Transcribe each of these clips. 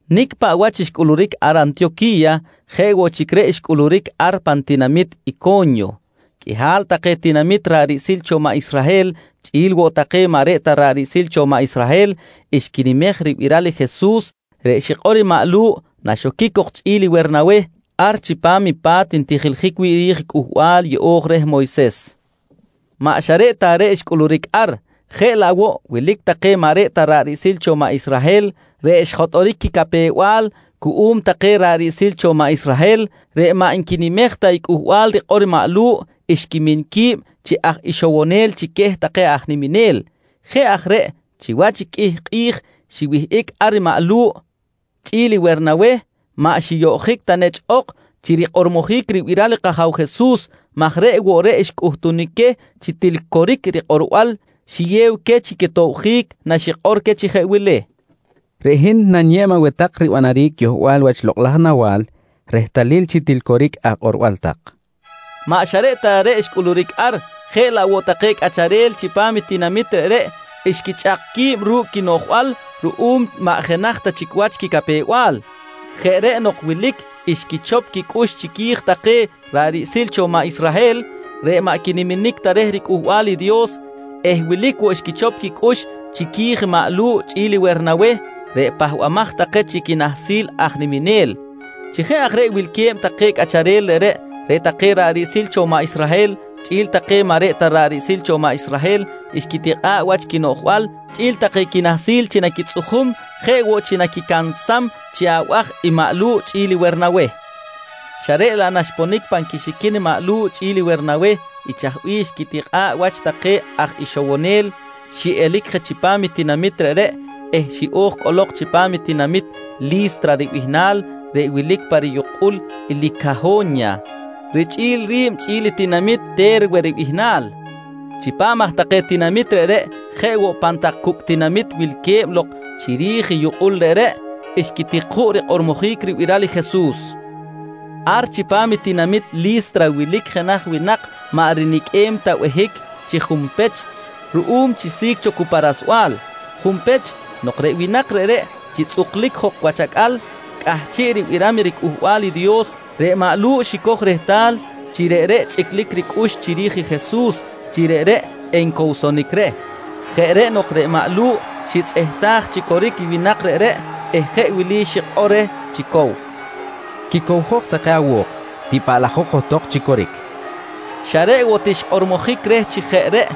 Nicꞌ paꞌ wach xcꞌuluric ar Antiyoqui̱ya jeꞌ woꞌ chic reꞌ xcꞌuluric ar pan tinamit Ico̱nyo. Qꞌuihal take tinamit ra̱ꞌ riꞌsil cho maꞌ Israhel chꞌi̱l woꞌ take maꞌ reꞌ ta ra̱ꞌ riꞌsil cho maꞌ Israhel xquinimej ribiral i Jesus reꞌ xikꞌor i maꞌ Lu̱ꞌ naxoquic cok chꞌi̱l i Wernaweh ar chipam i pa̱t ntijiljic wi̱ꞌ ri̱j Cꞌuhbal Yeꞌo̱j reh Moyses. Maꞌ xa reꞌ ta reꞌ xcꞌuluric ar, jeꞌ laꞌ woꞌ wilic take maꞌ reꞌ ta ra̱ꞌ riꞌsil cho maꞌ Israhel reꞌ xjotꞌoric quicapew-bal cuꞌum take ra̱ꞌ riꞌsil cho maꞌ Israhel reꞌ maꞌ nquinimej ta i cꞌuhbal rikꞌor maꞌ Lu̱ꞌ, xquimin qui̱b chi aj ixowonel chic queh take aj niminel. Jeꞌ aj reꞌ chiwach qꞌuih kꞌi̱j xiwihꞌic ar i maꞌ Lu̱ꞌ chꞌi̱l i Wernaweh, maꞌ xiyoꞌjic ta nechꞌ ok chi rikꞌormojic ribiral i kAja̱w Jesus maj reꞌ woꞌ reꞌ xcꞌuhtunic queh chi til coric i rikꞌorbal xiyew queh chi quitobjic naxikꞌor queh chi jeꞌ wili: «Reꞌ hin naniyeb aweh tak ribanaric yohbal wach lokꞌ laj nawa̱l rehtalil chi til coric akꞌorbal tak, nqui rikꞌorom queh. Maꞌ xa reꞌ ta reꞌ xcꞌuluric ar, jeꞌ laꞌ woꞌ take cꞌacharel chipam i tinamit reꞌreꞌ, xquichꞌak qui̱b ru̱cꞌ quinoꞌjbal ruꞌum maꞌ jenaj ta chic wach quicapew-bal. Jeꞌ reꞌ nok wilic xquichop quicꞌux chiqui̱j take ra̱ꞌ riꞌsil cho maꞌ Israhel reꞌ maꞌ quiniminic ta reh riCꞌuhbal i Dios eh wilic woꞌ xquichop quicꞌux chiqui̱j maꞌ Lu̱ꞌ chꞌi̱l i Wernaweh reꞌ pahbamaj take chi quinahsil aj niminel. Chi jeꞌ aj reꞌ wilque̱b wi̱ꞌ take cꞌacharel reꞌreꞌ, reꞌ take ra̱ꞌ riꞌsil cho maꞌ Israhel chꞌi̱l take maꞌ reꞌ ta ra̱ꞌ riꞌsil cho maꞌ Israhel xquitikꞌa̱ꞌ wach quinoꞌjbal chꞌi̱l take quinahsil chi naquitzꞌujum jeꞌ woꞌ chi naquicansam chi abaj maꞌ Lu̱ꞌ chꞌi̱l Wernaweh. Xa reꞌ laꞌ naxponic pan quixiquin maꞌ Lu̱ꞌ chꞌi̱l Wernaweh i chaj bih xquitikꞌa̱ꞌ wach take caj ixowonel, xiꞌelic je chipam tinamit reꞌreꞌ eh xiꞌo̱j cꞌolok chipam i tinamit Li̱stra ribihnal reꞌ wilic pa riyukꞌul i Licaho̱nya richꞌi̱l ri̱b chꞌi̱l i tinamit Te̱rwe ribihnal. Chipam aj take tinamit reꞌreꞌ jeꞌ woꞌ pan tak cucꞌ tinamit wilque̱b lok chiri̱j i yukꞌul reꞌreꞌ xquitik juꞌ rikꞌormojic ribiral i Jesus. Ar chipam i tinamit Li̱stra wilic jenaj winak maꞌ riniqꞌuem ta behic chi junpech ruꞌum chi si̱c cho cu pa rasbal. Junpech nok reꞌ winak reꞌreꞌ chi tzꞌuklic jok wach acꞌal cꞌahchiꞌ ribiram riCꞌuhbal i Dios, reꞌ maꞌ Lu̱ꞌ xicoj rehtal chi reꞌreꞌ chꞌiclic ricꞌux chiri̱j i Jesus chi reꞌreꞌ encowsonic reh. Jeꞌ reꞌ nok reꞌ maꞌ Lu̱ꞌ xitzꞌehtaj chi coric i winak reꞌreꞌ eh jeꞌ wili xikꞌor reh chi cow: «Quicowjok take awo̱k. Tipaꞌlajok johtok chi coric, nqui reh. Xa reꞌ woꞌ ti xkꞌormojic reh chi jeꞌ reꞌ,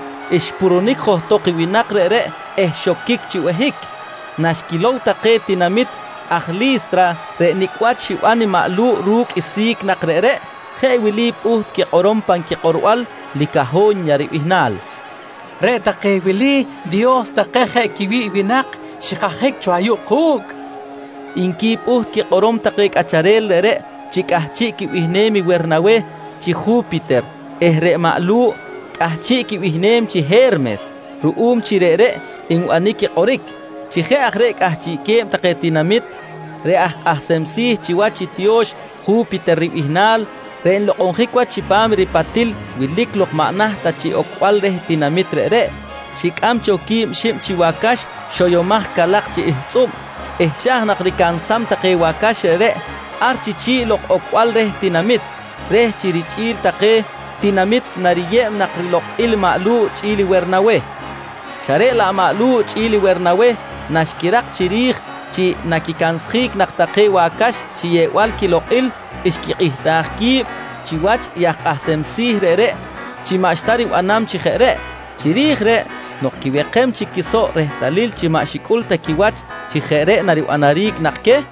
xpurunic johtok i winak reꞌreꞌ eh xoquic chi behic. Naxquilow take tinamit aj Li̱stra reꞌ nicꞌ wach xiban i maꞌ Lu̱ꞌ ru̱cꞌ i si̱c nak reꞌreꞌ, jeꞌ wili pꞌuht quikꞌorom pan quikꞌorbal Licaho̱nya ribihnal: «Reꞌ take wili, dios take jeꞌ quiwi̱ꞌ winak xikajic cho ayuꞌ ku̱cꞌ, nqui pꞌuht quikꞌorom take cꞌacharel reꞌreꞌ chi cꞌahchiꞌ quibihnem i Wernaweh chi Ju̱piter eh reꞌ maꞌ Lu̱ꞌ cꞌahchiꞌ quibihnem chi He̱rmes ruꞌum chi reꞌreꞌ nbanic i kꞌoric. Chi jeꞌ aj reꞌ cꞌahchiꞌque̱b take tinamit, reꞌ aj kꞌahsem si̱ chiwach i tiyo̱x Ju̱piter ribihnal reꞌ nlokꞌonjic wach chipam i ripatil wilic lok maꞌ naht ta chiꞌ ocbal reh tinamit reꞌreꞌ, xicꞌam cho quib xib chi wacax xoyomaj calak chi ihtzꞌub eh xa̱j nak ricansam take wacax reꞌreꞌ ar lok chi chi̱ꞌ lok i ocbal reh tinamit, reh chi richꞌi̱l take tinamit nariyeb nak rilokꞌil maꞌ Lu̱ꞌ chꞌi̱l Wernaweh. Xa reꞌ laꞌ maꞌ Lu̱ꞌ chꞌi̱l Wernaweh naxquirak chiri̱j chi naquicansjic nak take wacax chi yeꞌbal quilokꞌil, xquikꞌihtaj qui̱b chiwach i aj kꞌahsem si̱ reꞌreꞌ chi maꞌxta ribanam chi jeꞌ reꞌ. Chiri̱j reꞌ nok quiwekem chic quisoꞌ rehtalil chi maꞌ xicꞌul ta quiwach chi jeꞌ reꞌ naribanaric nak queh,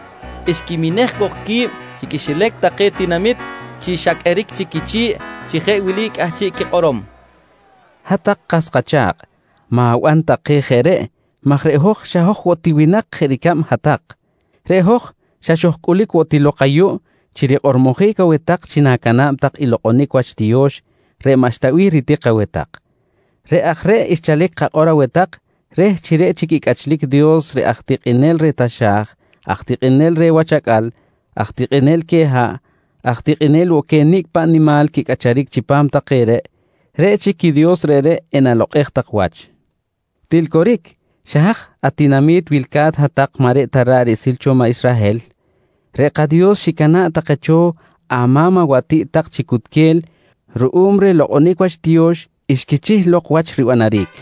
xquiminej cok qui̱b chi quixilac take tinamit chi xa qꞌueric chic quichi̱ꞌ chi jeꞌ wili cꞌahchiꞌ quikꞌorom: «Hat-tak kas kacha̱kꞌ, ma̱ban tak keh jeꞌ reꞌ maj reꞌ hoj xa hoj woꞌ ti winak jeꞌ ricab hat-tak. Reꞌ hoj xa xojcꞌulic woꞌ ti lok ayuꞌ chi rikꞌormojic aweh tak chi na̱cana̱b tak i lokꞌonic wach tiyo̱x reꞌ maꞌxta bih ritik aweh tak. Reꞌ aj reꞌ xchalic kakꞌor aweh tak reh chi reꞌ chic i cꞌachlic Dios reꞌ aj tikꞌinel reh taxa̱j, aj tikꞌinel reh wach acꞌal, aj tikꞌinel queh haꞌ, aj tikꞌinel woꞌ queh nicꞌ paꞌ nimal quicꞌacharic chipam take reꞌ, reꞌ chic i Dios reꞌreꞌ enalokꞌej tak wach. «Til coric, xa haj atinami̱t wilca̱t hat-tak maꞌ reꞌ ta ra̱ꞌ riꞌsil cho maꞌ Israhel, reꞌ kaDios xicana̱ꞌ take cho ama̱m awatiꞌt tak chi cutquel ruꞌum reh lokꞌonic wach tiyo̱x xquichih lok wach ribanaric,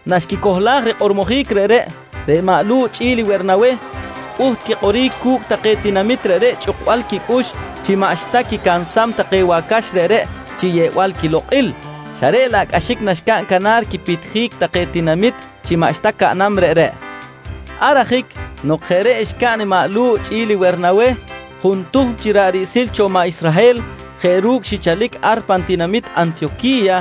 Naxquicohlaj rikꞌormojic reꞌreꞌ, reꞌ maꞌ Lu̱ꞌ chꞌi̱l Wernaweh pꞌuht quikꞌoric cu̱cꞌ take tinamit reꞌreꞌ chꞌuksbal quicꞌux chi maꞌxta quicansam take wacax reꞌreꞌ chi yeꞌbal quilokꞌil. Xa reꞌ laꞌ cꞌaxic naxcaꞌn canar quipitjic take tinamit chi maꞌxta caꞌnam reꞌreꞌ. Ar ajic nok jeꞌ reꞌ xcaꞌn i maꞌ Lu̱ꞌ chꞌi̱l Wernaweh, juntuhm chi ra̱ꞌ riꞌsil cho maꞌ Israhel jeꞌ ru̱cꞌ xichalic ar pan tinamit Antiyoqui̱ya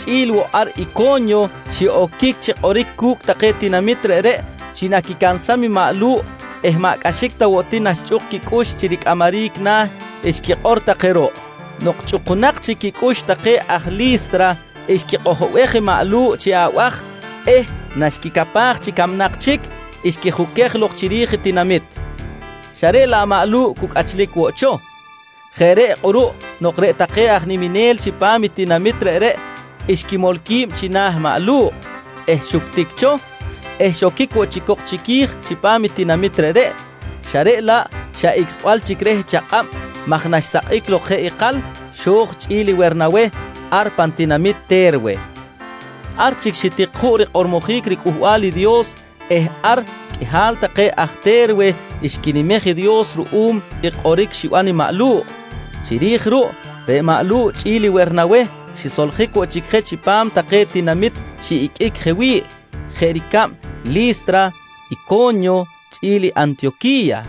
chꞌi̱l woꞌ ar Ico̱nyo xiꞌoquic chi kꞌoric cu̱cꞌ take tinamit reꞌreꞌ chi naquicansam i maꞌ Lu̱ꞌ eh maꞌ cꞌaxic ta woꞌ ti naxchꞌuk quicꞌux chi ricꞌamaric na̱ xquikꞌor take ruꞌ. Nok chꞌukunak chic quicꞌux take aj Li̱stra, xquikꞌojobej i maꞌ Lu̱ꞌ chi abaj eh naxquicapaj chi camnak chic, xquijuquej lok chiri̱j i tinamit xa reꞌ laꞌ maꞌ Lu̱ꞌ cu cꞌachlic woꞌ cho. Jeꞌ reꞌ kꞌuruꞌ nok reꞌ take aj niminel chipam i tinamit reꞌreꞌ xquimol qui̱b china̱ maꞌ Lu̱ꞌ, xuctic cho eh xoquic woꞌ chic cok chiqui̱j chipam i tinamit reꞌreꞌ xa reꞌ laꞌ xa icꞌsbal chic reh chakꞌab maj naxsakꞌic lok jeꞌ ikal, xo̱j chꞌi̱l i Wernaweh ar pan tinamit Te̱rwe. Ar chic xitik juꞌ rikꞌormojic riCꞌuhbal i Dios eh ar qꞌuihal take aj Te̱rwe xquinimej i Dios ruꞌum i kꞌoric xiban i maꞌ Lu̱ꞌ. Chiri̱j ruꞌ reꞌ maꞌ Lu̱ꞌ chꞌi̱l Wernaweh xisoljic woꞌ chic je chipam take tinamit xiꞌiqꞌuic je wi̱ꞌ, jeꞌ ricab Li̱stra, Ico̱nyo chꞌi̱l Antiyoqui̱ya.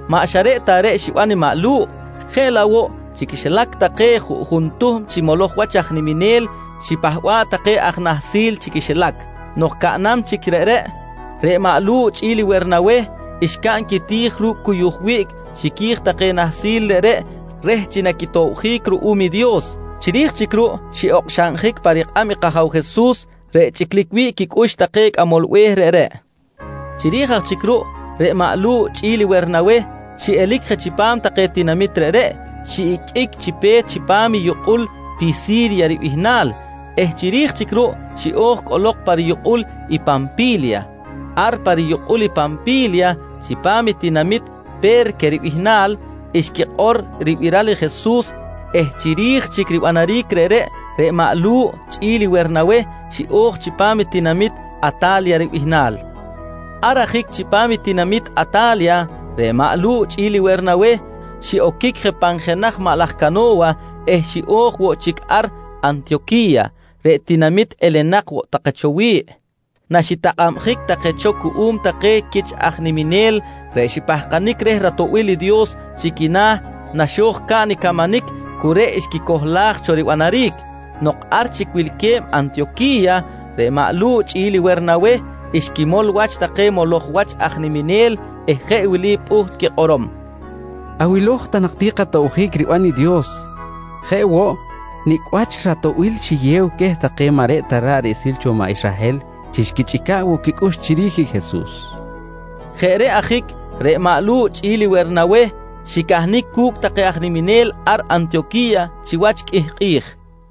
Maꞌ xa reꞌ ta reꞌ xiban i maꞌ Lu̱ꞌ, jeꞌ laꞌ woꞌ chi quixilac take juꞌjun tuhm chi moloj wach aj niminel xipahba̱ꞌ take aj nahsil chi quixilac. Nok caꞌnam chic reꞌreꞌ, reꞌ maꞌ Lu̱ꞌ chꞌi̱l Wernaweh xcaꞌn quiti̱j ru̱cꞌ cuyuj wiꞌc chiqui̱j take nahsil reꞌreꞌ reh chi naquitobjic ruꞌum i Dios. Chiri̱j chic ruꞌ xiꞌokxaꞌnjic pa rikꞌab i kAja̱w Jesus reꞌ chꞌiclic wi̱ꞌ quicꞌux take cꞌamol be̱h reꞌreꞌ. Chiri̱j aj chic ruꞌ, reꞌ maꞌ Lu̱ꞌ chꞌi̱l Wernaweh xiꞌelic je chipam take tinamit reꞌreꞌ, xiꞌiqꞌuic chi pe̱t chipam i yukꞌul Pisi̱rya ribihnal eh chiri̱j chic ruꞌ xiꞌo̱j cꞌolok pa riyukꞌul i Panpi̱lya. Ar pa riyukꞌul Panpi̱lya, chipam i tinamit Pe̱rque ribihnal xquikꞌor ribiral i Jesus eh chiri̱j chic ribanaric reꞌreꞌ, reꞌ maꞌ Lu̱ꞌ chꞌi̱l Wernaweh xiꞌo̱j chipam i tinamit Ata̱lya ribihnal. Ar ajic chipam i tinamit Ata̱lya, reꞌ maꞌ Lu̱ꞌ chꞌi̱l Wernaweh xiꞌoquic je pan jenaj maꞌ laj cano̱wa eh xiꞌo̱j woꞌ chic ar Antiyoqui̱ya, reꞌ tinamit elenak cho take wi̱ꞌ naxitakꞌabjic take cho cuꞌum take quich aj niminel reꞌ xipahkanic reh ratoꞌbil i Dios chi quina̱ naxo̱j caꞌn i camanic cu reꞌ xquicohlaj cho ribanaric. Nok ar chic wilque̱b Antiyoqui̱ya, reꞌ maꞌ Lu̱ꞌ chꞌi̱l Wernaweh xquimol wach take moloj wach aj niminel eh jeꞌ wili pꞌuht quikꞌorom: «Awilo̱j ta nak tak ti katobjic riban i Dios jeꞌ woꞌ nicꞌ wach i ratoꞌbil xiyew queh take maꞌ reꞌ ta ra̱ꞌ riꞌsil cho maꞌ Israhel chi xquichꞌica̱ꞌ woꞌ quicꞌux chiri̱j Jesus, nqui xikꞌor queh. Jeꞌ reꞌ ajic reꞌ maꞌ Lu̱ꞌ chꞌi̱l i Wernaweh xicahnic cu̱cꞌ take aj niminel ar Antiyoqui̱ya chiwach qꞌuih kꞌi̱j.